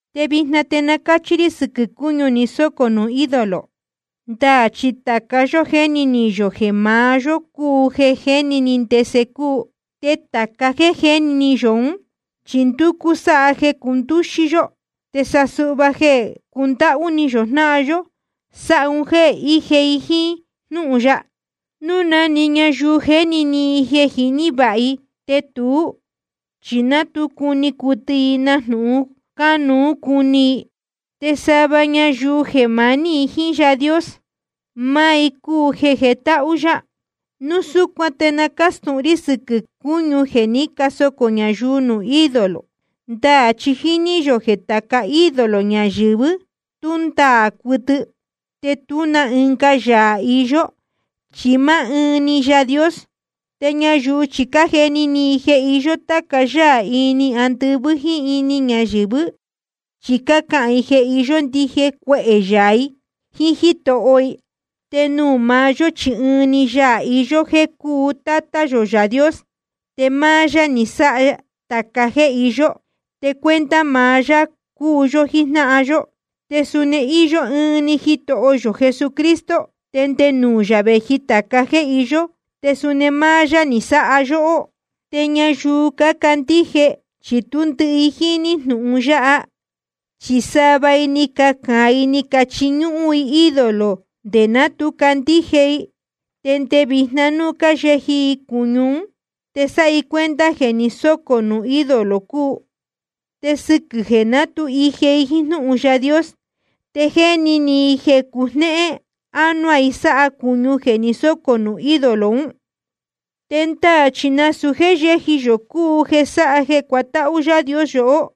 Te vijna te na cáchi rī sɨquɨ̄ cūñu ni sócō nuū ídolo. Ndaā chi tāca yó jéni ni yō jeē maá yó cúu jeē jiní ndese cúu. Te tāca jéē jiní yō ún, chi ndúcú sáha jeē cundúxí yó. Te sa suhva jeē cundáhú ni yō jnáhan yó, sáha un jéē íje i jíín jnúhun ya. Núu na‑ni ñayuu jéni ni i jeē jiní vāha i, te tuú chi ná tu cuni cuɨtɨ i nájnūhun cánuú cuni i. Te sa suhva ñayuu jeē maní i jíín Yaā Dios, máá i cúu jeē jetáhú yá. Núu súcuan te na cástūhun rí sɨquɨ̄ cúñu jeē ní casocō ñayuu nuū ídolo. Ndaā chi jíní yō jeē tāca ídolo ñayɨ̄vɨ́, tú ndaā cuɨtɨ. Te tú na ɨnga yaā iyó, chi máá ɨɨn‑ni Yaā Dios. Te ñayuu chi cájeni ni i jeē iyó táca yáā ini andɨvɨ́ jíín ñáyɨ̄vɨ́, chi cácahān i jeē iyó ndije cuehē yaā i jíín jítoho i. Te nuū maá yó chi ɨɨn‑ni Yaā iyó, jeē cúu Tátá yō Yaā Dios. Te máá yá ni sáha tāca jéē iyó, te cuenta maá yá cúu yó jíjnáhan yó. Te suni íyó ɨɨn‑ni Jitoho yō Jesucristo, te nde nuū maá yá vēji tāca jéē iyó, te suni máá yá ni sáha yóhó. Te ñayuu cácandíje, chi tú ndɨhɨ i jíní jnūhun yáha. Chi sava i ni cacāan i ni chiñúhún i ídolo nde ná tu candíje i. Te nde vijna núu cáyeji i cūñu ún te sáha i cuenta jeē ni sócō nuū ídolo cúu. Te sɨquɨ̄ jeē ná tu ije i jíín jnúhun Yaā Dios, te jéni ni i jeē cujnéhén ánuá i sáha cūñu jeē ni sócō nuū ídolo ún. Te ndaā chi nasūu jéē yéji yō cúu jeē sáha jeē cuatáhú Yaā Dios yohó.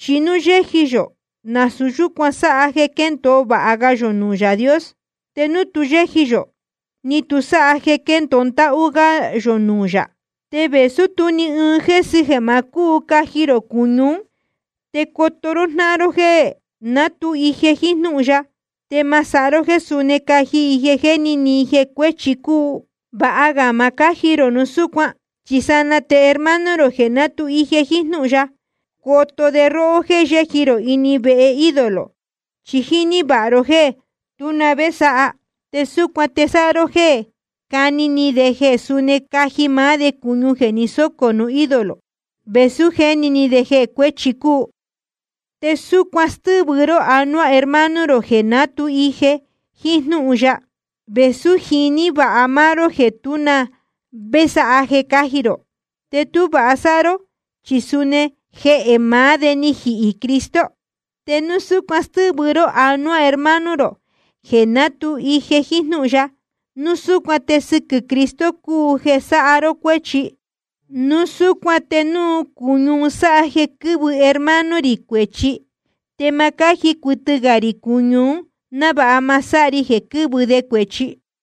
Chi núu yéji yō, nasūu yúcuan sáha jeē quéndōo vāha ga yō nuū Yaā Dios. Te núu tu yéji yō, ni tu sáha jeē quéndōo ndáhú gá yō nuū yā. Te vēsú tú ni ɨɨn jésɨ jeē ma cúu caji rō cūñu ún, te coto ró jnáhan ró jéē ná tu ije jíín jnúhun ya, te ma sáha ró jéē suni caji i jeē jéni ni i jeē cuēchi cúu. Vāha ga ma cáji rō núu súcuan, chi sanaa te hermano rō jeē ná tu ije jíín jnúhun ya, coto de róhó jéē yéji rō ini vehe ídolo, chi jíní vāha ró jéē tú na vé sáha. Te súcuan te sáha ró jéē cájni ni de jeē suni caji maá de cūñu jeē ni sócō nuū ídolo, vēsú jéni ni de jeē cuēchi cúu. Te súcuan stɨ́vɨ ró anuá hermano rō jeē ná tu ije jíín jnúhun ya, vēsú jiní vāha máá ró jeē tú na vé sáha jeē cáji rō. Te tú vāha sáha ró, chi suni jehē maá de ni jihī Cristo. Te núu súcuan stɨ́vɨ ró anuá hermano rō jeē ná tu ije jíín jnúhun ya, núu súcuan te sɨquɨ̄ Cristo cúu jeē sáha ró cuéchi. Núu súcuan te núu cūñu un sáha jeē quɨ́vɨ hermano rī cuēchi, te ma cáji cuɨtɨ ga rī cūñu ún, návāha ma sáha ri jeē quɨ́vɨ de cuēchi.